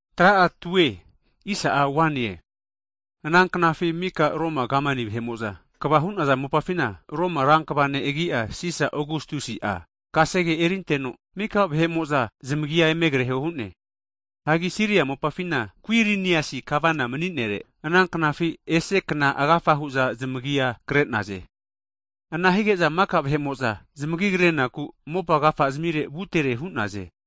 Hagi ana knafi mika Romu kamani vahe'mo'za kva hu'naza mopafina, Romu rankva ne' agi'a Sisa Ogastusi'a kasege erinteno, maka vahe'mo'za zamagia eme kreho hu'ne. Hagi Siria mopafina Kuiriniasi Gavana mani'nere, ana knafi ese kna agafa hu'za zamagia kre'naze. Ana hige'za maka vahe'mo'za zamagi kre'naku mopa agafa zimire vutere hu'naze.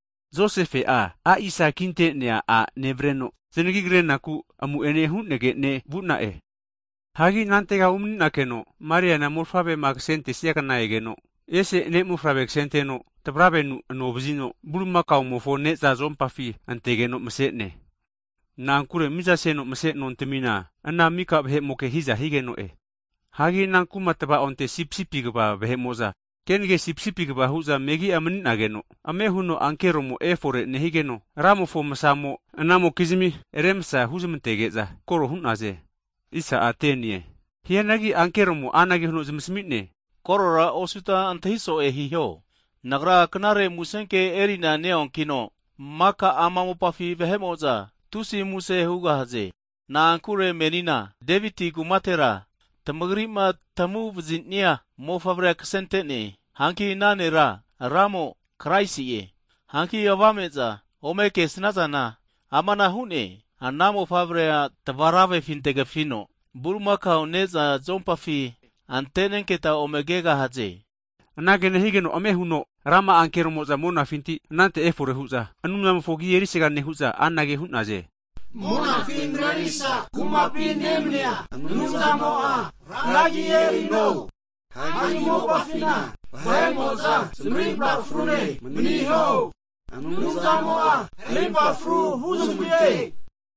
Josefe'a a'isa kinte'nea a' nevareno, Kamani vahe'mo'za zanagima krenagu amu'ene hu'negene vu'na'e. Hagi anantega umaninakeno, Mariana mofavrema kasentesia kna egeno, ese ne' mofavre kasenteno tavravenu ano vazino, bulimakamofo ne'za zuompafi antegeno mase'ne. Na'ankure miza seno mase nontamina ana mika vahe'moke hiza higeno'e. Hagi ana kuma tva'onte, sipisipi kva vahe'mo'za kenage sipisipia kva hu'za megi'a mani'nageno, ame huno ankeromo efore nehigeno, Ramofo masa'amo anamokizmi remsa hunezmantege'za koro hu'naze. Hianagi ankeromo anage huno zamasami'ne, Kore osuta antahi so'e hiho, nagra Knare Musenke eri'na neonkino, maka ama mopafi vahe'mo'za tusi muse hugahaze. Na'ankure menina Deviti kumatera, tamagri'ma tamagu'vazinia mofavre kasente'ne. Hanki ana nera Ramo, Kraisi'e. Hanki avame'za ome kesnazana amana hu'ne, ana mofavre tavaravefi antegafino bulimakao ne'za zuompafi ante'nenketa ome kegahaze. Anage nehigeno, ame huno rama'a ankeromo'za monafinti anante efore hu'za, Anumzamofo agi erisaga nehu'za anage hu'za, Monafi marerisa kumapi nemania Anumzamo'a Ra agi erino. Hagi mopafina vahe'mo'za zamarimpa frune maniho. Anumzamo'a rimpa fru huzmante!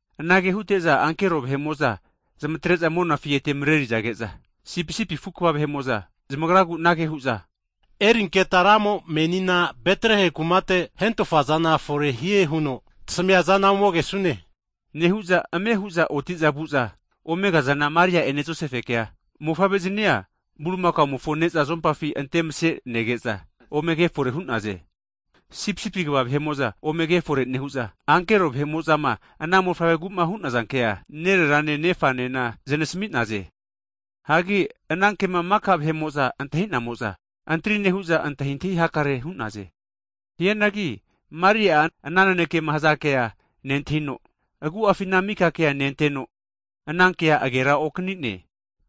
Anage hute'za ankero vahe'mo'za zamatre'za monafi ete marerizage'za, sipisipi afu kva vahe'mo'za zamagragura anage hu'naze, Erinketa Ramo'ma menina Betlehemu kumate hentofazana forehie huno tasamiazana ome kesune. Nehu'za ame hu'za oti'za vu'za ome kazana Maria'ene Josefekea, mofavre'zinia bulimakamofo ne'za zuompafi antemase nege'za ome ke fore hu'naze. Sipsipi kva vahe'mo'za ome ke fore nehu'za, ankero vahe'mo'zama ana mofavregu hu'naza kea, nererane nefanena znasami'naze. Hagi ana kema maka vahe'mo'za antahi'zamo'za, antri nehu'za antahintahi hakare hu'naze. Hianagi Maria'a ana nanekema hazankea nentahino, agu'afi ana maka kea nenteno ana kea agera okani'ne.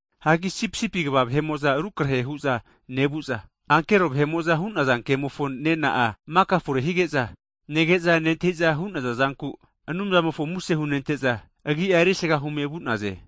Hagi sipisipi kva vahe'mo'za rukrahe hu'za nevu'za, ankero vahe'mo'za hu'naza kemofo nena'a maka fore hige'za, nege'za nentahiza hu'naza zanku, Anumzamofo muse hunente'za, Agi'a erisaga hume vu'naze.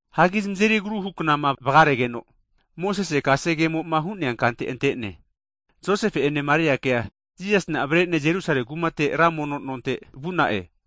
Hagi zamazeri agruhu knama vagaregeno, Mosese kasegemo'ma hu'nea kante ante'ne Josefe ene Mariakea Jisasina avare'ne Ra Anumzamofo aminaku Jerusalemi kumate ra mono nompi vu'na'e.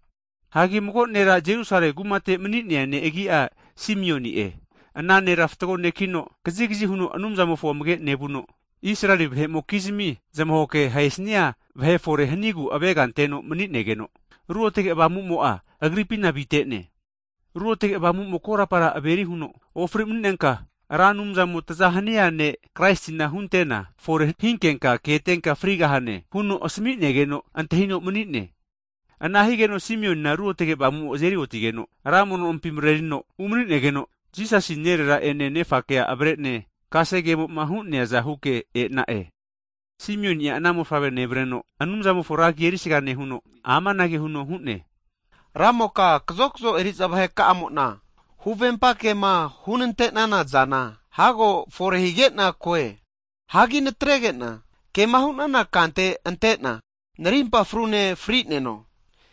Hagi mago nera Jerusalemi kumate mani'nea ne' agi'a Simioni'e. Ana nera fatgo nekino, kazigazi huno Anumzamofo amage anteno nevuno, Israeli vahe'mokizmi zamahoke ahesnia vahe fore hanigu avega anteno mani'negeno, Ruotge Avamumo'a agripina avite'ne. Ruotge Avamumo korapa averi huno, ofri mani'nenka, Ra Anumzamo taza hania ne' Kraisina huntena fore hinkenka ketenka frigahne, huno asami'negeno antahino mani'ne. Ana higeno Simionina Ruotage Avamumo azeri otigeno, ra mono nompi marerino umani'negeno, Jisasi nerera ene nefakea avare'ne kasegemoma hu'neaza huke e'na'e. Simioni'a ana mofavre nevareno, Anumzamofo ra agi erisaga nehuno amanage huno hu'ne. Ramoka kazokazo eri'za vaheka'amo'na, huvempa kema hunante'nana zana hago fore hige'na koe. Hagi natrege'na kema hunana kante ante'na narimpa frune fri'neno.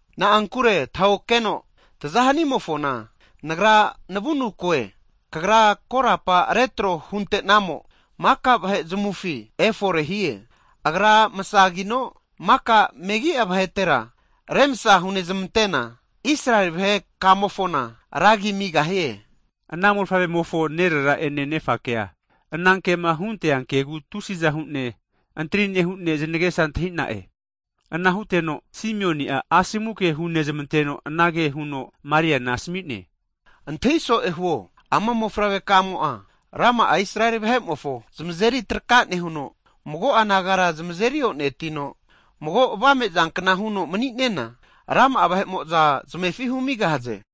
Na'ankure tahokeno taza hanimofona, nagra navunu koe, Kagra korapa retro hunte'namo maka vahe zamufi efore hie. Agra masagino maka megi'a vahetera remsa hunezmantena, Israeli vahe kamofona ra agi amigahie. Ana mofavremofo nerera'ene nefakea ana kema huntea kegu tusiza hu'ne antri nehune antahintahi hakare hu'na'e. Ana huteno, Simioni'a asomu ke hunezmanteno, anage huno Mariana asami'ne, Antahi so'e huo. Ama mofavre kamo'a rama'a Israeli vahe'mofo zamazeri traka nehuno, mago'a nagara zamazeri onetino, mago avame'zankna huno mani'nena, rama'a vahe'mo'za zamefi humigahaze.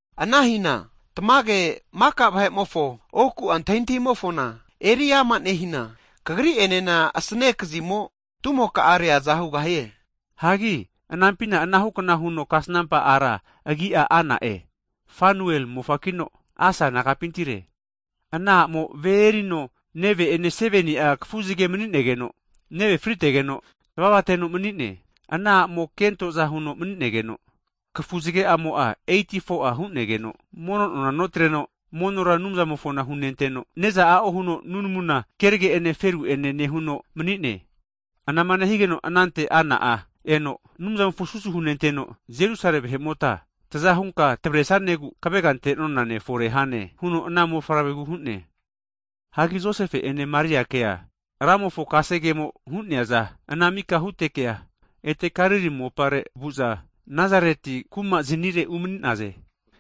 Ana hina tamage maka vahe'mofo oku'a antahintahimofona eri ama nehina, kagri'enena asane kazimo tumoka'a reaza hugahie. Hagi anampina anahu kna huno kasnampa ara agi'a Ana'e, Fanuel mofakino, Asa nagapintire. Ana a'mo ve erino neve'ene 7ni'a kafuzage mani'negeno, neve'a frigetegeno, manime vuno tavava teno mani'ne. Ana a'mo'a kentoza huno maninegeno kafuzage'amo'a 84'a hu'negeno mono nona notreno, monora Anumzamofona hunenteno, ne'za a'o huno nunamuna kenage'ene feru enena nehuno mani'ne. Anama nehigeno anante ana a'mo'a eno, Anumzamofona susu hunenteno, Jerusalemi vahe'ma zamaza huno zamavaresanigu avegama ante'naza mofavre fore hie huno huama huno zamasami'ne. Hagi Josefe ene Mariakea Ramofo kasegemo'ma hu'neazana ana mika huteke, ete Galili mopare vu'za, Nazarete kumazinire umani'naze.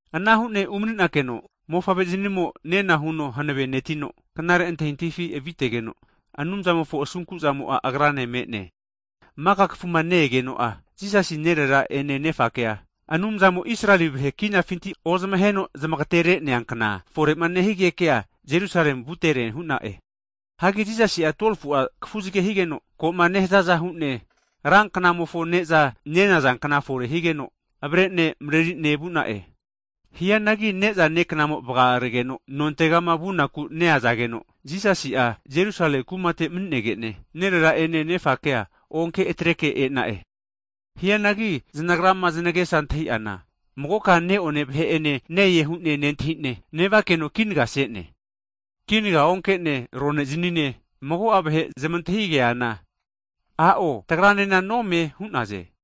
Ana hu'ne umaninakeno, Mofavre'zinimo nena huno hanave netino, knare antahintahifi avitegeno, Anumzamofo asunkuzamo'a Agrane me'ne. Maka kafuma ne-egeno'a Jisasi nerera ene nefakea, Anumzamo Israeli vahe kinafinti ozmaheno zmagaterenea kna (Pasova) fore'ma nehigekea, Jerusalemi vutere hu'na'e. Hagi Jisasi'a 12fu'a kafuzage higeno, koma neha'aza hu'ne ra knamofo ne'za nenaza kna fore higeke avare'ne marerine vu'na'e. Hianagi ne'za neknamo vagamaregeno, nontegama vunaku neazageno, Jisasi'a Jerusalemi kumate mani'negene, nerera ene nefakea onke atreke e'na'e. Hianagi zanagrama zanagesa antahi'ana, magoka e'nona vahe'ene ne-e hu'ne nentahine nevakeno kinagase'ne. Kinaga onke'ne rone'zinine, mago'a vahe zamantahigazana, a'o tagranena nome hu'naze.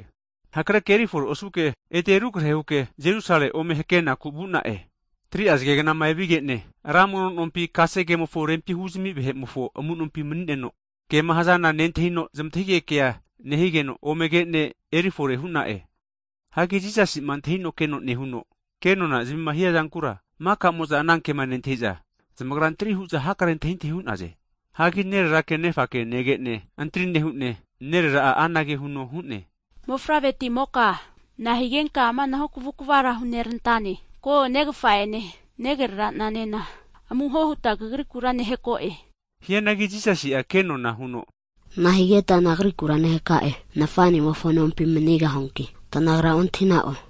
Hakreke erifore osuke, ete rukrehe huke Jerusalemi ome hakenaku vu'na'e. Hagi 3'a zagegnama enevige'ne, ra mono nompi kasegemofo rempi huzami vahe'mofo amunompi manineno, kema hazana nentahino zamantahige kea nehigeke, ome kene eri fore hu'na'e. Hagi Jisasi'ma antahino keno nehuno, kenonazamima hiazankura, maka'mo'za ana kema nentahiza, zamagra antri hu'za hakare antahintahi hu'naze. Hagi nererake nefake nege'ne, antri nehune, nerera'a anage huno hu'ne. Mofavre timoka na'a higenka amanahu kavukvara hunerantane? Ko, negafa'ene, nagranena amuhohuta kagrikura nehako'e. Hianagi Jisasi'a kenona huno, Nahigeta Nagrikura nehaka'e? Nafa'nimofo nompi manigahuanki tanagra ontahina'o?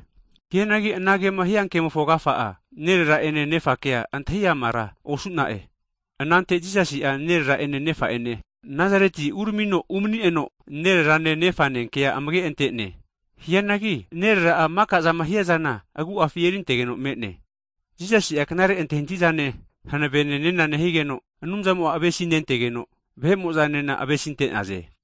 Hianagi anagema hiankemofo agafa'a nerera'ene nefakea antahi amara osu'na'e. Anante Jisasi'a nerera'ene nefa'ene Nasareti uramino umani'neno, nererane nefane kea amage ante'ne. Hianagi nerera'a maka'zama hiazana agu'afi erintegeno me'ne. Jisasi'a knare antahintahizane hanavene nena nehigeno, Anumzamo'a avesinentegeno, vahe'mo'zanena avesinte'naze.